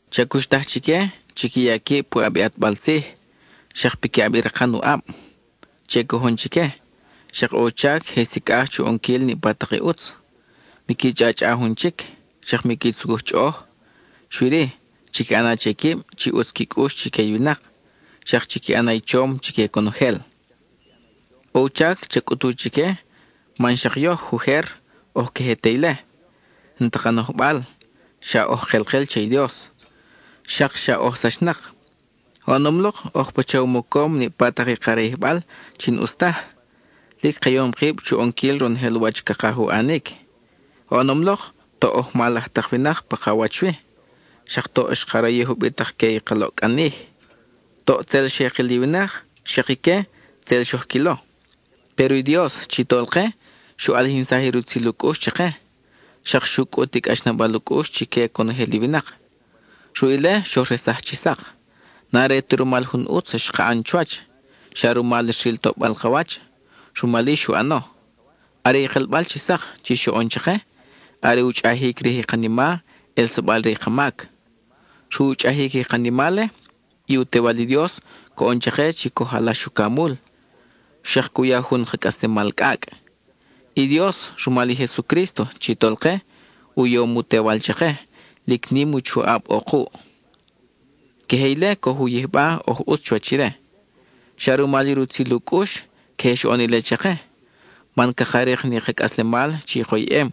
Cha cuxtaj chique, chiqui ya quib puʼab i ʼatbal tzij, xak piquiʼab i rakan u ʼab; che cojon chique; xak ʼo u chac je sicʼaj chu ʼonquil niʼpa tak i ʼutz. Miqui chʼachʼa jun chic, xak miqui tzucuj chʼoʼoj; xui-ri, chiqui ʼana che quib chi ʼutz qui cʼux chique i winak, xak chiqui ʼana i chom chique conojel. ʼO u chac ca cʼut chique, man xak yoj ujer, oj queje te ile; n-ta ka nojbal, xa oj kelkel che i Dios, xak xa oj sachnak. Oʼonom lok oj pacha u mocom niʼpa i ka rayijbal chi n-ʼus taj, lic ka yom kib chu ʼonquil ronojel wach cakaj u ʼanic. Oʼonom lok, toʼ oj mal laj tak winak pa ka wach wi, xak toʼ xka rayij ubitak-que i ka loʼcʼanij. Toʼ tzel xe kil i winak, xak ique tzel xoj quilo. Péro i Dios chi Tolke xu ʼalijinsaj i rutzil u cʼux chake, xak xu cʼut i cʼaxnabal u cʼux chique conojel i winak. Ruʼ ile, xoj resaj chi sak. N-are ta rumal jun ʼutz xka ʼan chuwach, xa rumal xril toʼbal ka wach, rumal-i xu ʼano. Are i kelbal chi sak chi xoʼon chake, are u chʼajic rij i kanima ʼelsabal re i ka mac. Ruʼ u chʼajic i kanima-le, i u Tewal i Dios coʼon chake chi coj alax ucamul, xak cu ya jun ka cʼaslemal cʼacʼ. I Dios, rumal i Jesucrísto chi Tolke, u yom u Tewal chake, y lic nim i u choʼab ʼo kuʼ; queje ile coj u yijba oj ʼutz chuwach ire. Xa rumal i rutzil u cʼux queje xoʼon ile chake, man caka rik ni ka cʼaslemal chi koyʼem,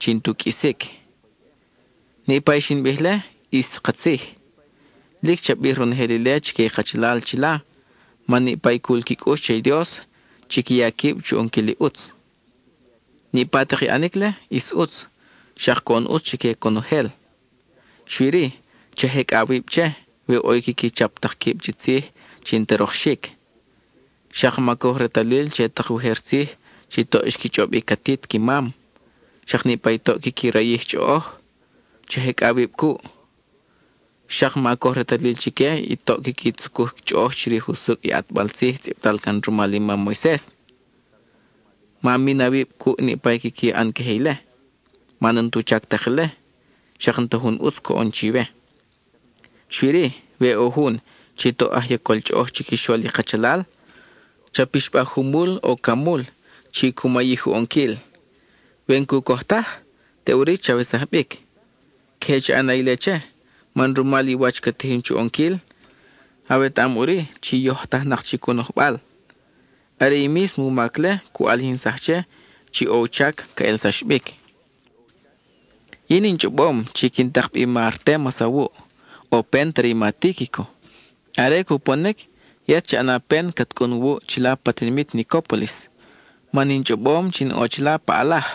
chi n-tu qʼuisic. Niʼpa i xin bij-le ʼis katzij. Lic cha bij ronojel ile chique i kachalal chila, man niʼpa i cul qui cʼux che i Dios chiqui ya quib chu ʼonquil i ʼutz. Niʼpa tak i ʼanic-le, ʼis ʼutz, xak coʼon ʼutz chique conojel. Xui-ri, cha jecʼa awib che, we ʼo i quiqui chap tak quib chi tzij chi n-ta rokxic; xak ma coj retalil che tak ujer tzij chi toʼ xqui chʼob i catit qui mam; xak niʼpa i toʼ quiqui rayij chʼoʼoj, cha jecʼa awib cuʼ. Xak ma coj retalil chique i toʼ quiqui tzucuj chʼoʼoj chirij usucʼ i ʼatbal tzij tzʼibtal can rumal i mam Moises. Ma min awib cuʼ niʼpa i quiqui ʼan queje ile, man n-tu chac tak ile, xak n-ta jun ʼutz coʼon chiwe. Xui-ri, we ʼo jun chi toʼ aj yacol chʼoʼoj chiquixol i kachalal, cha pixbaj jumul o camul chi cu mayij u ʼonquil. We n-cu coj taj, teʼuri chawesaj bic. Queje cha ʼana ile che, man rumal i wach ca tijin chu ʼonquil, awetaʼam ʼuri chi yojtajnak chic u nojbal. Are i mísmo u mac-le cu ʼalijinsaj che chi ʼo u chac ca ʼelsax bic. Yin in chʼobom chi quin tak bi i ma Artémas awuʼ, o pent are i ma Tíquico. Are cuponic, yet cha ʼana pen cat cʼun wuʼ chila pa tinimit Nicópolis, man in chʼobom chi in ʼo chila pa ʼalaj.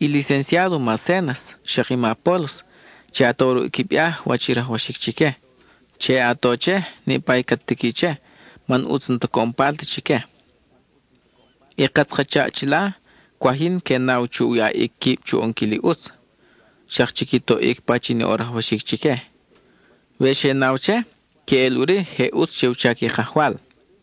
I licenciádo ma Zénas, xak i ma Apólos, che a to ruʼ i qui viáje wach i rajwaxic chique; che a to che, niʼpa i cat tiqui che, man ʼutz n-ta coʼon palt chique. I katz ka chaʼ chila, cwaj yin que naw chu yaʼic quib chu ʼonquil i ʼutz, xak chiqui toʼic pachin ʼo rajwaxic chique. We xe naw che, queʼel ʼuri je ʼutz che u chac i Kajwal.